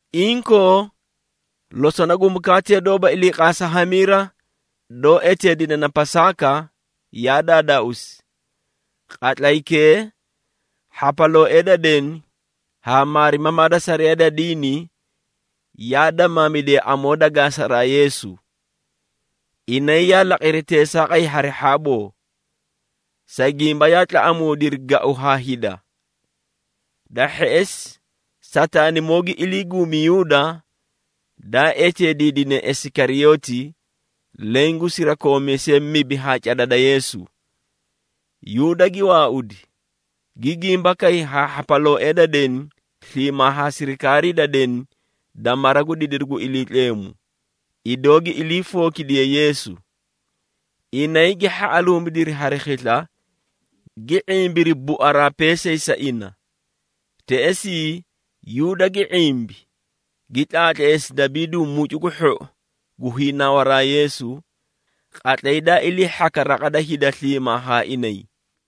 Inkoo, losona gu mukaate doóba iliiqaasa hamiira, doó eteedine na Pasaaka, yaa daadaauusi. Qatlaykee, hhapalooee da deni haa maarimamaa da sariyaa da diini, yaa damaamidiyay amoo da gaasaraa Yeesu. Inay yaa laqiri teesaaqay hari hhaaboo, sa gimba yaa tlaꞌamuudiri gau haa hida. Da hheꞌesi, Sataanimoo gi ilii guumi Yuuda, daa eteediidine Isikariyooti, leẽ gu sirakoomiisee mibi haa cada da Yeesu. Yuuda gi waaudi, gi gimbakay haa hhapalooee da deni sliimaa haa sirikaarii da deni da mara gu didiru gu Iliitleemu, idoo gi ilii fookidiye Yeesu. Inay gi hhaꞌaluumidiri hari khisla, gi ⁄imbiri buaraa peesay sa ina. Teꞌesii, Yuuda gi ⁄imbi, gi tlaatleesi dabiidu mucu gu hhou gu hiinawaraa Yeesu, qatlay da ilii hhaka raqa da hida sliimaa haa inay.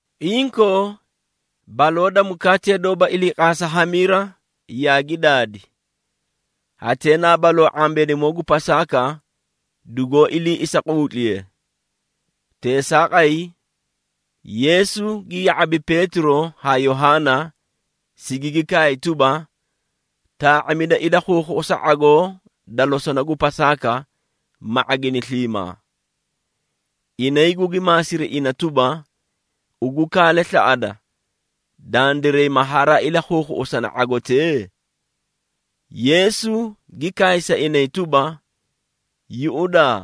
Inkoo, baloo da mukaatee doóba iliiqaasa hamiira yaagi daadi. Hatee na baloo ⁄ambeenimoo gu Pasaaka dugoó ilii isahiiquutliye. Teesaaqay, Yeesu gi ya⁄abi Peetiro haa Yohaana, sigigi kaay tuba, “Taa⁄amida ilakhuukhuꞌusa ⁄agoo da losona gu Pasaaka, ma ⁄agini sliimaa.” Inay gugi maasiri ina tuba, “Ugu kaale slaꞌada, dandiray ma haraa ilakhuukhuꞌusani ⁄agotee?” Yeesu gi kaay sa inay tuba, “Yuꞌudaa!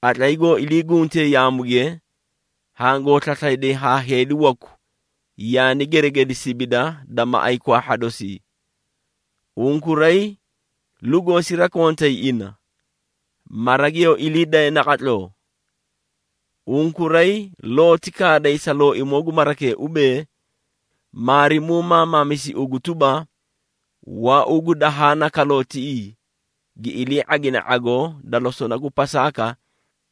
Qatlay goo ilii guntee yaamuge, hangoo slaslayday haa heedi waku yaani geregedi sibida da maꞌay kwaahha dosii. Unkuray lugoo sirakontay ina, mara giyoo ilii daye naqatloo. Unkuray looti kaaday sa looimoo gu marakee ubee, ‘Maarimuu maamaamisi ugu tuba, waauu gu dahaa na kaloo tiꞌii, gi ilii ⁄agine ⁄agoo da losona gu Pasaaka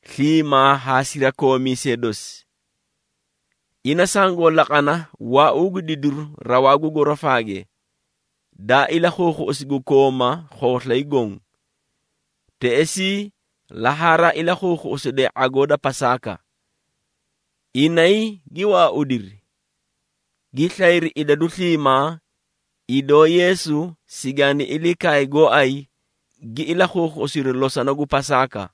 sliimaa haa sirakoomiisee dosi.’ Ina sangoo laqana waauu gu didiru rawaa gu gorofaage, daa ilakhuukhuꞌusi gu koomaa khooslay goõ. Teꞌesii la haraa ilakhuukhuꞌusiday ⁄agoo da Pasaaka.” Inay gi waaudiri, gi slayri idadu sliimaa, idoo Yeesu sigaani ilii kaay gooay gi ilakhuukhuꞌusiri losona gu Pasaaka.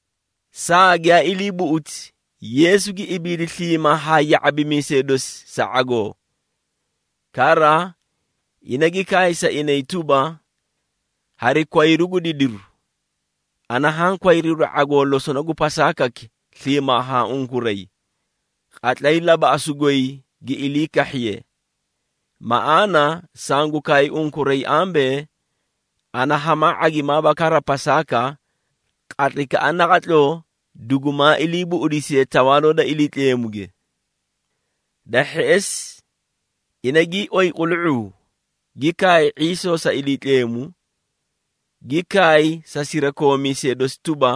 Saa giyaa ilii buꞌuti, Yeesu gi ibiidi sliimaa haa ya⁄abimiisee dosi sa ⁄agoo. Kara, ina gi kaay sa inay tuba, “Hari kwayru gu didiru, ana haã kwayruudi ⁄agoo losona gu Pasaakaki sliimaa haa unkuray, qatlay labaꞌasu goy gi ilii kahhiye. Maꞌaana, sangu kaay unkuray ambee, ana hamaa ⁄agimaaba kara Pasaaka, qatlaykaꞌa naqatloo dugumaa iliibuꞌudisiye Tawaaloo da Iliitleemuge.” Da hheꞌesi, ina gii oyi qulu⁄uu, gi kaay ⁄iisoo sa Iliitleemu, gi kaay sa sirakoomiisee dosi tuba,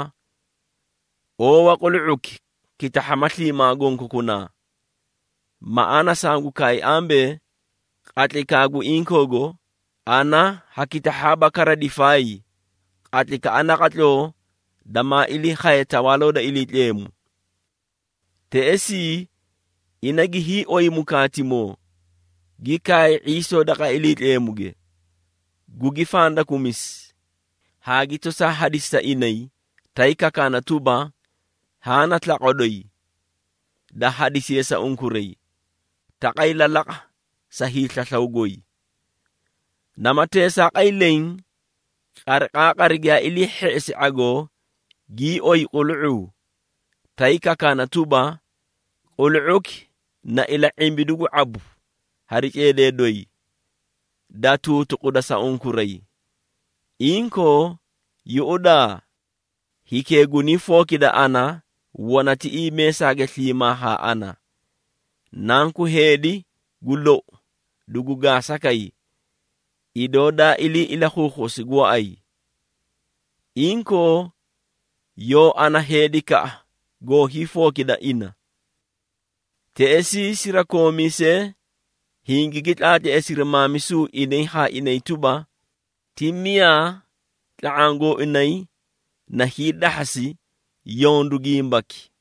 “Owaa qulu⁄uki kitahhama sliimaa gonkokunaa. Maꞌaana, sangu kaay ambee, qatlaykaa gu inkoogo, ana ha kitahhaaba kara difaay, qatlaykaꞌa naqatloo damaa ilii khaye Tawaaloo da Iliitleemu.” Teꞌesii, ina gii oyi mukaatimoo, gi kaay ⁄iisoo daqa Iliitleemuge, gugi fandakumisi, haa gi tosaa hadisi sa inay, tay kakaana tuba, “Haã na slaqwa doyi, da hadisiye sa unkuray. Taqay lalaqa sa hiislaslaw goy.” Nama teesaaqay leẽ, qariqaaqari gii oyi qulu⁄uu giyaa ilii hheꞌesiri ⁄agoo, gii oyi qulu⁄uu, tay kakaana tuba, “Qulu⁄uki na ila⁄imbidu gu ⁄abu hari ceedee doyi, da tuutuquda sa unkuray. Inkoo, yuꞌudaa! Hikee guniifookida ana, wana tiꞌii meesaage sliimaa ha ana. Nanku Heedi, gu lou dugu gaasa kay, idoo daa ilii ilakhuukhuꞌusi gooay. Inkoo, yoo ana heedikaꞌa goo hiifookida ina.” Teꞌesii, sirakoomiisee hingigi tlaatleesiri maamisu inay haa inay tuba, ti miyaa tla⁄aã gooinay na hiidahhasi yondu gimbaki.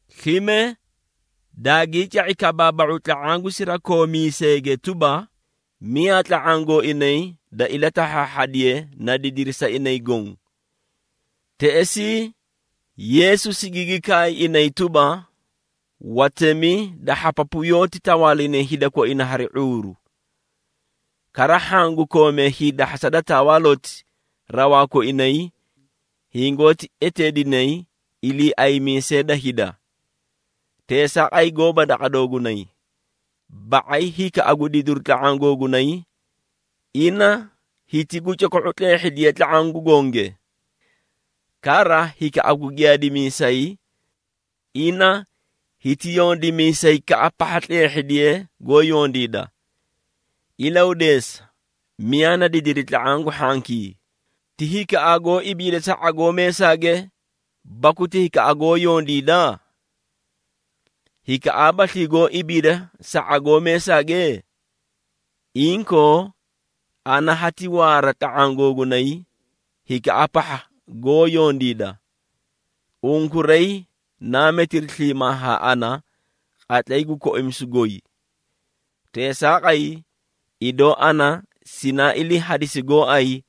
Slime daagii ca⁄i kabaaba⁄u tla⁄aã gu sirakoomiiseege tuba, miyaa tla⁄aã gooinay da ilatahhaahhadiye na didiri sa inay goõ. Teꞌesii, Yeesu sigigi kaay inay tuba, “Watemi da hhapapu yoóti tawaalinay hida koina hari ⁄uuru. Kara hhaã gu koomee hiidahhasa da tawaaloti rawaa koinay, hingoóti eteedinay iliiaymiisee da hida. Teesaaqay gooba daqa doogunay, ba⁄ay hikaꞌa gu didiru tla⁄aã googunay, ina hiti gu coko⁄u tleehhidiye tla⁄aã gu gonge. Kara hikaꞌa gu giyaadimiisay, ina hiti yondimiisaykaꞌa pahha tleehhidiye goó yondiida. Ilahudeesa, miyaa na didiri tla⁄aã gu hhankii. Ti hikaꞌaa goó ibiida sa ⁄agoo meesaage, baku ti hikaꞌa goó yondiida? Hikaꞌaabaslii goó ibiida sa ⁄agoo meesaage? Inkoo, ana hati waara tla⁄aã googunay, hikaꞌa pahha goó yondiida. Unkuray naa metiri sliimaa haa ana, qatlay gu koimisu goy. Teesaaqay, idoo ana sinaa ilii hadisi gooay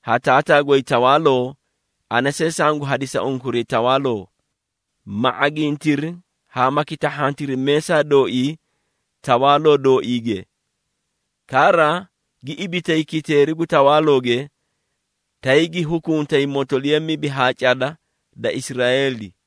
ha Taataa goy tawaaloo, ana see sangu hadisa unkuray tawaaloo, ma ⁄agintiri haa ma kitahhantiri meesaa dooii Tawaaloo dooiige. Kara, gi ibitay kiteeri gu tawaalooge, tay gi hukuntay motoliya mibi haa cada da Israeeli.”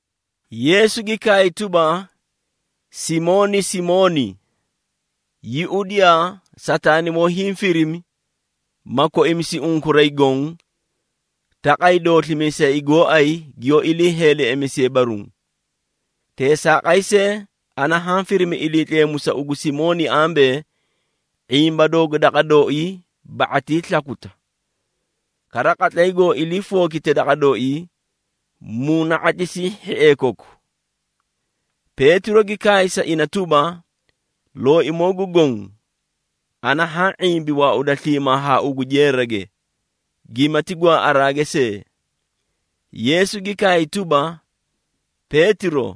Yeesu gi kaay tuba, “Simooni, Simooni! Yuꞌudiyaa! Sataanimoo hiĩ firimi, ma koimisi unkuray goõ, taqay dooslimiisay gooay giyoó ilii heeleꞌemisiye baruũ. Teesaaqay see, ana haã firimi Iliitleemu sa ugu Simooni ambee, ⁄imba doogu daqa dooii ba⁄atii slakuta. Kara qatlay goo ilii fookite daqa dooii, muuna⁄atlisii hhiee koku.” Peetiro gi kaay sa ina tuba, “Looimoo gu Goõ, ana haã ⁄imbi waauda sliimaa haa ugu jeerage, gimati gwaaꞌaraage see.” Yeesu gi kaay tuba, “Peetiro,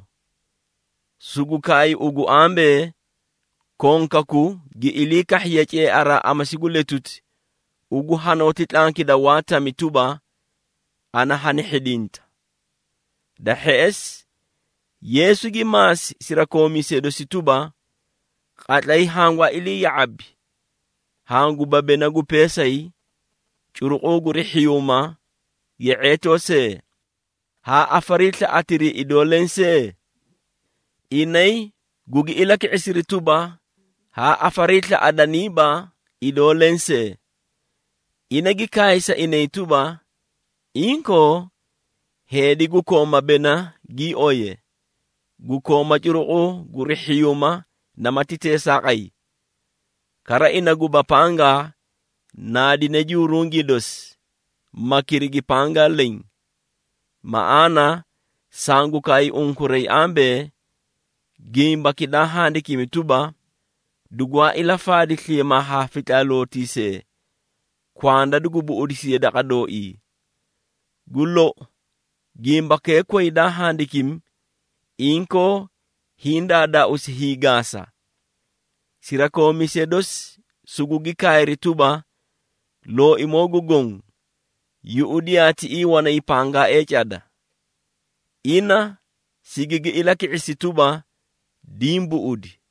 sugu kaay ugu ambee, konkaku gi ilii kahhiye ceearaa amasi gu letuti, ugu hanooti tlankida waa tami tuba, ana hani hhidinta.” Da hheꞌesi, Yeesu gi maasi sirakoomiisee dosi tuba, “Qatlay hangwaa ilii ya⁄abi, hanguba bena gu peesay, curuqu guri hhiyuuma, ye⁄eetoo see, haa afariislaꞌatirii idoo lensee?” Inay gugi ilaki⁄isiri tuba, “Haa afariislaꞌaniiba idoo lensee.” Ina gi kaay sa inay tuba, “Inkoo, heedi gu kooma bena gii oye, gu kooma curuqu guri hhiyuuma namati teesaaqay. Kara ina guba pangaa, naadine jurungii dosi, ma kirigi pangaa leẽ. Maꞌaana, sangu kaay unkuray ambee, gimbaki daa handikimi tuba, ‘Dugwaa ilafaadi sliimaa haa fitlaalootiisee,’ kwanda dugu buꞌudisiye daqa dooii. Gu lou, gimbakee koyi daa handikimi, inkoo hiĩ daadaauusi hiigaasa.” Sirakoomiisee dosi sugugi kaayri tuba, “Looimoo gu Goõ, yuꞌudiyaa tiꞌii wanay pangaaee cada.” Ina sigigi ilaki⁄isi tuba, “Diĩ buꞌudi.”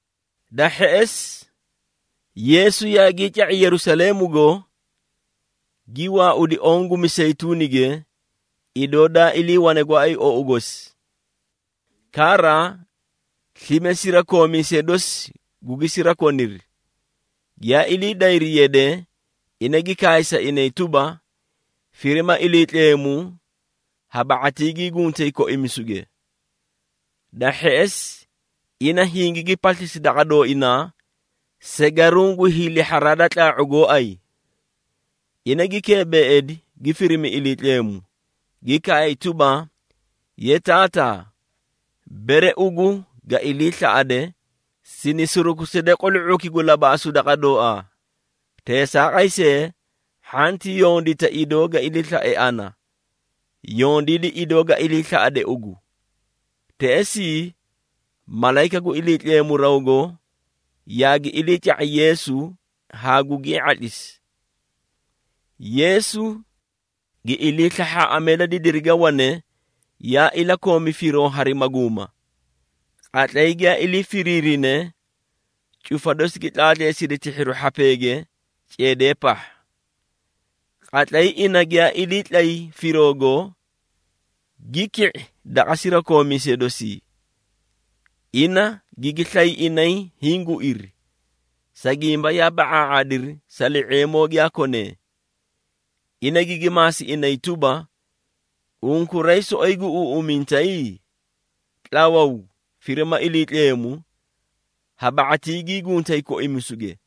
Da hheꞌesi, Yeesu yaagii ca⁄i Yerusaleemugo, gi waaudi oõ gu Miseyituunige, idoo daa iliiwane gooay ou gosi. Kara, slime sirakoomiisee dosi gugi sirakoniri. Giyaa ilii dayri yade, ina gi kaay sa inay tuba, “Firima Iliitleemu ha ba⁄atii gii guntay koimisuge.” Da hheꞌesi, ina hingigi paslisi daqa dooinaa, segaruũ gu hiilihharaa da tlaa⁄u gooay. Ina gi keebeeidi, gi firimi Iliitleemu, gi kaay tuba, “Ye Taataa, bere ugu ga iliislaꞌade, sini surukuside qulu⁄uki gu labaꞌasu daqa dooaa. Teesaaqay see, hhanti yondita idoo ga iliislae ana, yondiidi idoo ga iliislaꞌade ugu.” Teꞌesii, malayika gu Iliitleemu rawgo yaagi iliica⁄i Yeesu haa gugii ⁄atlisi. Yeesu gi ilii slahhaaꞌamee da didirige wane, yaa ilakoomi firoo hari maguuma. Qatlay giyaa ilii firiirine cufa dosi gi tlaatleesidi tihhiru hhapeege ceedee pahha. Qatlay ina giyaa iliitlay firoogo, gi ki⁄i daqa sirakoomiisee dosii. Ina gigi slay inay hiĩ guiri, sa gimba yaa ba⁄aa⁄aadiri sa li⁄eemoo giyaa konee. Ina gigi maasi inay tuba, “Unkuray soꞌoyi guꞌuuꞌumintay? Tlawuu, firima Iliitleemu, ha ba⁄atii gii guntay koimisuge.”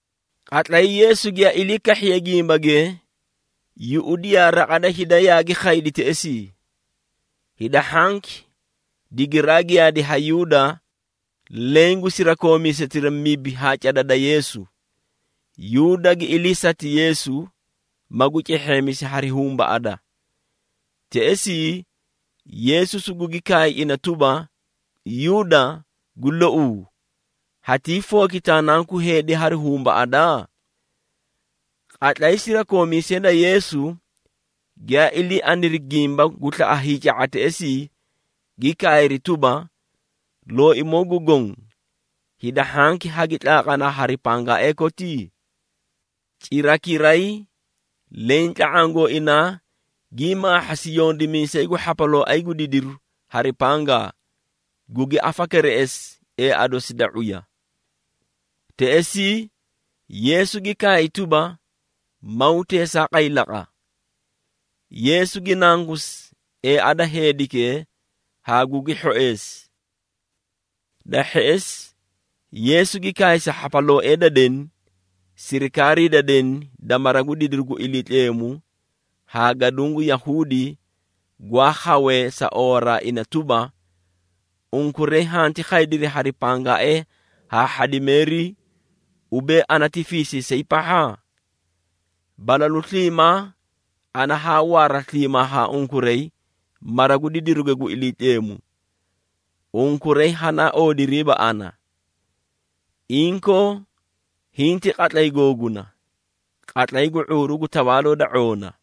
Qatlay Yeesu giyaa ilii kahhiye gimbage, yuꞌudiyaa raqa da hida yaagi khaydi teꞌesii. Hida hhanki digiraa giyaadi ha Yuuda, leẽ gu sirakoomiisetira mibi haa cada da Yeesu. Yuuda gi iliisati Yeesu, magu cehheemisi hari humbaꞌada. Teꞌesii Yeesu sugugi kaay ina tuba, “Yuuda, gu louu, hatiifookita Nanku Heedi hari humbaꞌada?” Qatlay sirakoomiisee da Yeesu giyaa ilii aniri gimba gu slaꞌa hiica⁄a teꞌesii, gi kaayri tuba, “Looimoo gu Goõ, hida hhanki hagi tlaaqanaa hari pangaaee koti?” Cirakiray, leẽ tla⁄aã gooinaa, gii maahhasi yondimiisay gu hhapalooay gu didiru hari pangaa, gugi afakereꞌesi eea dosi da ⁄uya. Teꞌesii, Yeesu gi kaay tuba, “Maw teesaaqay laqa!” Yeesu gi nangusi eea da heedikee haa gugi hhoeesi. Da hheꞌesi, Yeesu gi kaay sa hhapalooee da deni, sirikaarii da deni da mara gu didiru gu Iliitleemu haa gaduũ gu Yahuudi gwaa khawee sa oowaraa ina tuba, “Unkuray hanti khaydiri hari pangaaee haa hhadimeerii, ubee ana ti fiisiisay pahha? Balalu sliimaa ana haa waara sliimaa haa unkuray mara gu didiruge gu Iliitleemu, unkuray hanaa oodiriiba ana. Inkoo, hiĩ ti qatlay googuna, qatlay gu ⁄uuru gu tawaaloo da ⁄oona.”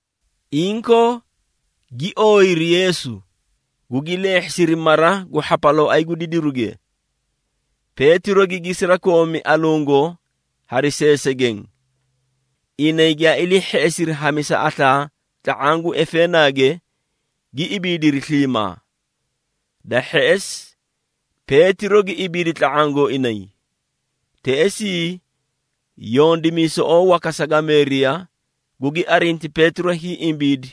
Inkoo, gi ooyiri Yeesu, gugi leehhesiri mara gu hhapalooay gu didiruge. Peetiro gigi sirakoomi alungo hari seesegeẽ. Inay giyaa ilii hheꞌesiri hamisa aslaa tla⁄aã gu efeenaage, gi ibiidiri sliimaa. Da hheꞌesi Peetiro gi ibiidi tla⁄aã gooinay. Teꞌesii, yondimiisoꞌoo waka sagameeriya gugi arinti Peetiro hiĩ ibiidi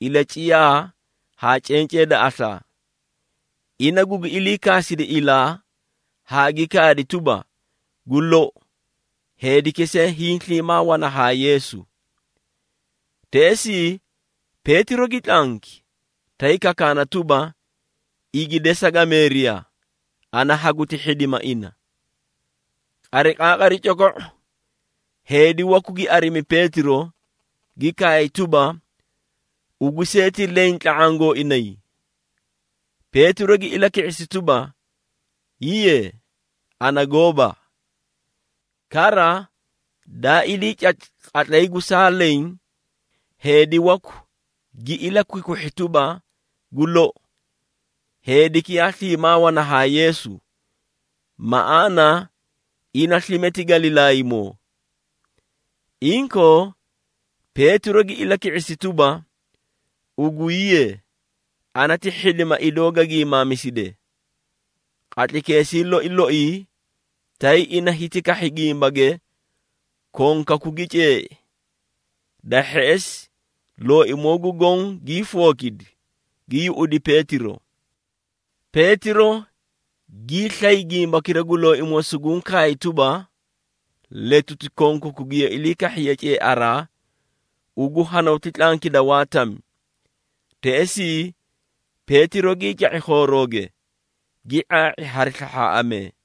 ilaciyaa haa cencee da aslaa. Ina gugi iliikaasidi ilaa haa gi kaadi tuba, “Gu lou, heediki see hiĩ sliimaa wana haa Yeesu.” Teꞌesii, Peetiro gi tlanki, tay kakaana tuba, “Igi de sagameeriya, ana haguti hhidima ina.” Qariqaaqari coko⁄o, heedi waku gi arimi Peetiro, gi kaay tuba, “Ugu see ti leẽ tla⁄aã gooinay!” Peetiro gi ilaki⁄isi tuba, “Hiiye, ana gooba!” Kara, daa ilii cati qatlay gu saa leẽ, heedi waku gi ilakwikwihhi tuba, “Gu lou, heediki yaa sliimaa wana haa Yeesu, maꞌaana ina slime ti Galilaaymoo.” Inkoo, Peetiro gi ilaki⁄isi tuba, “Ugu hiiye, ana ti hhidima idoo ga giimaamiside.” Qatlaykeesii loi loi, tay ina hiti kahhi gimbage, konkaku gi ceei. Da hheꞌesi, Looimoo gu Goõ, gii fookidi, gi yuꞌudi Peetiro. Peetiro giislay gimbakira gu Looimoo suguũ kaay tuba, “Letuti konkaku giyoo ilii kahhiye ceearaa, ugu hanooti tlankida waa tami.” Teꞌesii, Peetiro gii ca⁄i khoorooge, gi ⁄aa⁄i hari slahhaaꞌamee.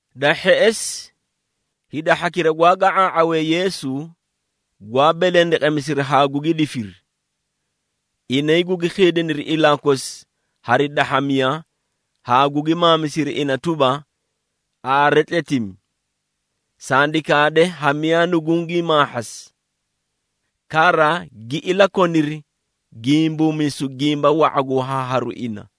Da hheꞌesi, hida hhakira gwaa ga⁄aa⁄awee Yeesu, gwaa belendeqemisiri haa gugi difiri. Inay gugi khiidiniri ilaa kosi hari dahhamiya haa gugi maamisiri ina tuba, “Aare tletimi! Sandi kaade ha miyaa nugungii maahhasi!” Kara gi ilakoniri gimbuumisu gimba wa⁄a gu wahaaharu ina.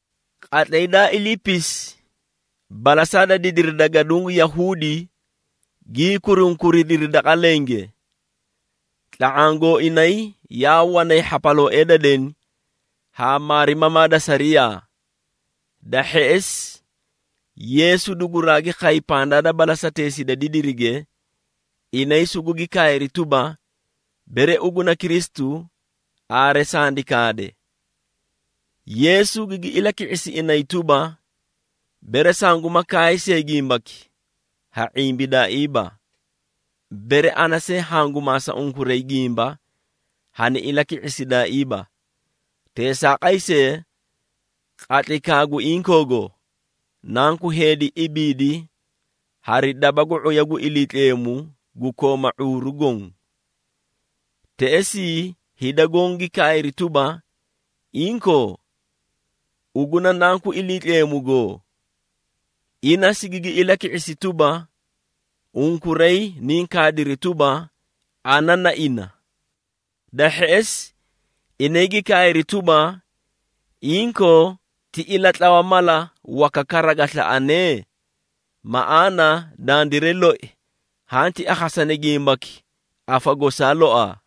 Qatlay daa iliipisi, balasaa da didiri da gaduũ gu Yahuudi gii kurunkuridiri daqa lenge. Tla⁄aã gooinay yaa wanay hhapalooee da deni haa maarimamaa da sariyaa. Da hheꞌesi, Yeesu duguraagi khay pandaa da balasateesii da didirige. Inay sugugi kaayri tuba, “Bere ugu na Kristu, aare sandi kaade.” Yeesu gigi ilaki⁄isi inay tuba, “Bere sanguma kaay see gimbaki, ha ⁄imbidaaiiba. Bere ana see hangu maasa unkuray gimba, hani ilaki⁄isidaaiiba. Teesaaqay see, qatlaykaa gu inkoogo, Nanku Heedi ibiidi hari daba gu ⁄uya gu Iliitleemu, gu kooma ⁄uuru goõ.” Teꞌesii hida goõ gi kaayri tuba, “Inkoo, ugu na Nanku Iliitleemugo?” Ina sigigi ilaki⁄isi tuba, “Unkuray niĩ kaadiri tuba, ana na ina.” Da hheꞌesi, inay gi kaayri tuba, “Inkoo, ti ilatlawa mala waka kara ga slaꞌane? Maꞌaana, dandiray loi hanti akhasani gimbaki afa gosaa loaa.”